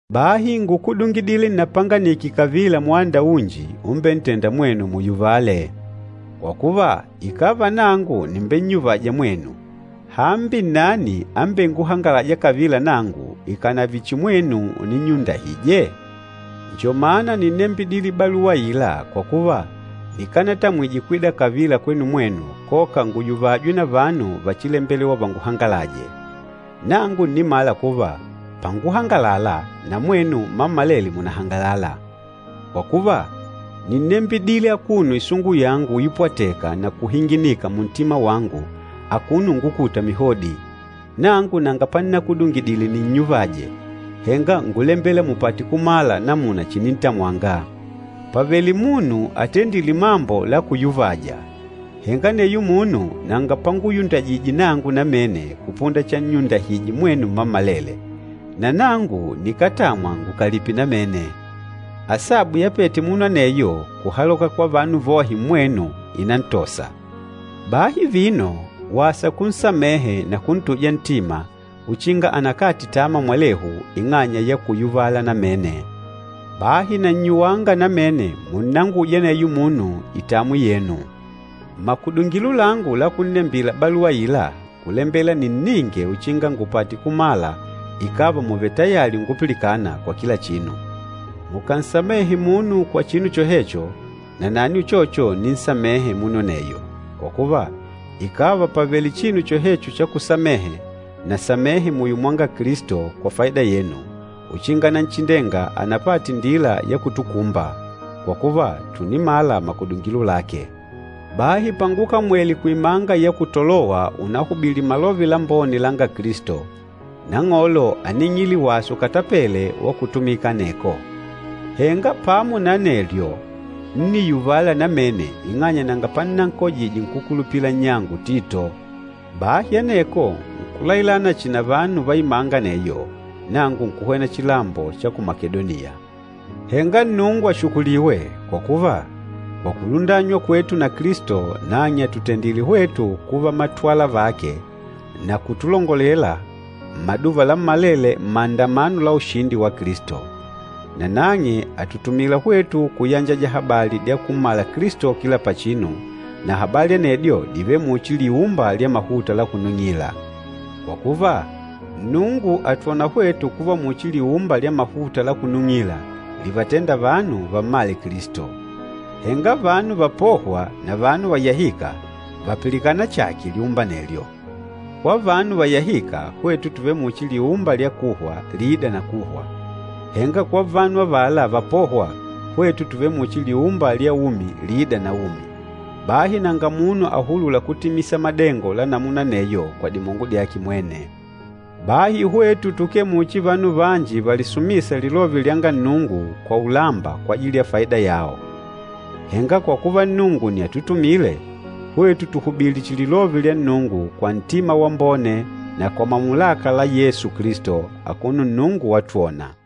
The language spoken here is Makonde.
Bahi ngúkudungidile nnapanganike kavila mwanda unji umbentênda mwenu muyuvale. Kwa kuva, ikàva nangu nìmbennyuvaja mwenu, hambi nnani ambenguhangalâja kavila nangu, ikànave chihi mwenu uninnyundahije? Njo mana nínnembidile baluwa aila kwa kuva nikanatamwije kwida kavila kwenu mwenu koka nguyuvajwe na vanu vachilembelewa vanguhangalaje. Nangu ǹnimala kuva panguhangalala, na mwenu mmammalele mùnahangalala. Kwa kuva, nínnembidile akuno isungu yangu uipwateka na kuhinginika muntima wangu akuno ungukuta mihodi. Nangu nanga pannakudungidile ninnyuvaje, henga ngúlembela mupate kumala namuna chinintamwanga. Pàvele munu atendîle mambo la kuyuvaja, henga aneyo munu nanga panguyundahije nangu namene kupunda channyundahije mwenu mmammalele, na nangu nikátamwa ngukalipe namene. Asabu yapete munu aneyo kuhaloka kwa vanu vohe mmwenu, ìnantosa. Bahi vino, wasa kunsamehe na kuntuja ntima uchinga anakate tama mwalehu ing'anya ya kuyuvala namene. Bahi nannyuwanga namene munnanguje aneyo munu itamwi yenu. Makudungilo langu la kunnembila baluwa aila ngúlembela ninninge uchinga ngupate kumala ikàva mùvele tayali ungupilikana kwa kila chinu. Mukànsamehe munu kwa chinu chohecho, nanani uchocho ǹninsamehe munu aneyo. Kwa kuva, ikàva pàvele chinu chohecho cha kusamehe, nasamehe muyo mwanga Kilisto kwa faida yenu, uchinga Nanchindenga anapate indila ya kutukumba. Kwa kuva, tùnimala makudungilo lake. Bahi pangukamwele kuimanga ya ku Tolowa unahubili Malove Lambone langa Kilisto, Nang'olo áning'ile wasa ukatapele wa kutumika aneko. Henga pamo na anelyo, ńniyuvala namene ing'anya nanga pannankojije nkúkulupila nnyangu Tito. Bahi aneko nkulailana chihi na vanu va imanga aneyo, nangu nkuhwena chilambo cha ku Makedoniya. Henga Nnungu ashukuliwe, kwa kuva kwa kulundanywa kwetu na Kilisto nang'e àtutendile hwetu kuva matwala vake na kutulongolelela mmaduva lammalele mmaandamano la ushindi wa Kilisto. Na nang'e àtutumila hwetu kuyanjaja habali dya kummala Kilisto kila pachinu, na habali anedyo dìvele muchi liumba lya mahuta la kunung'ila. Kwa kuva, Nnungu àtwona hwetu kuva muchi liumba lya mahuta la kunung'ila livatênda vanu vammale Kilisto. Henga vanu vapôhwa na vanu vayahîka, vàpilikana chààke liumba anelyo. Kwa vanu vayahîka hwetu tùvele muchi liumba lya kuhwa liîda na kuhwa, henga kwa vanu avala vapôhwa hwetu tùvele muchi liumba lya umi liîda na umi. Bahi nanga munu ahulûla kutimisa madengo la namuna aneyo kwa dimongo dyake mwene. Bahi hwetu tukee muchi vanu vanji valisumîsa lilove lyanga Nnungu kwa ulamba kwajili ya faida yao. Henga kwa kuva Nnungu nni atutumîle, hwetu tùhubili chihi lilove lya Nnungu kwa ntima wambone na kwa mamulaka la Yesu Kilisto, akuno Nnungu watwona.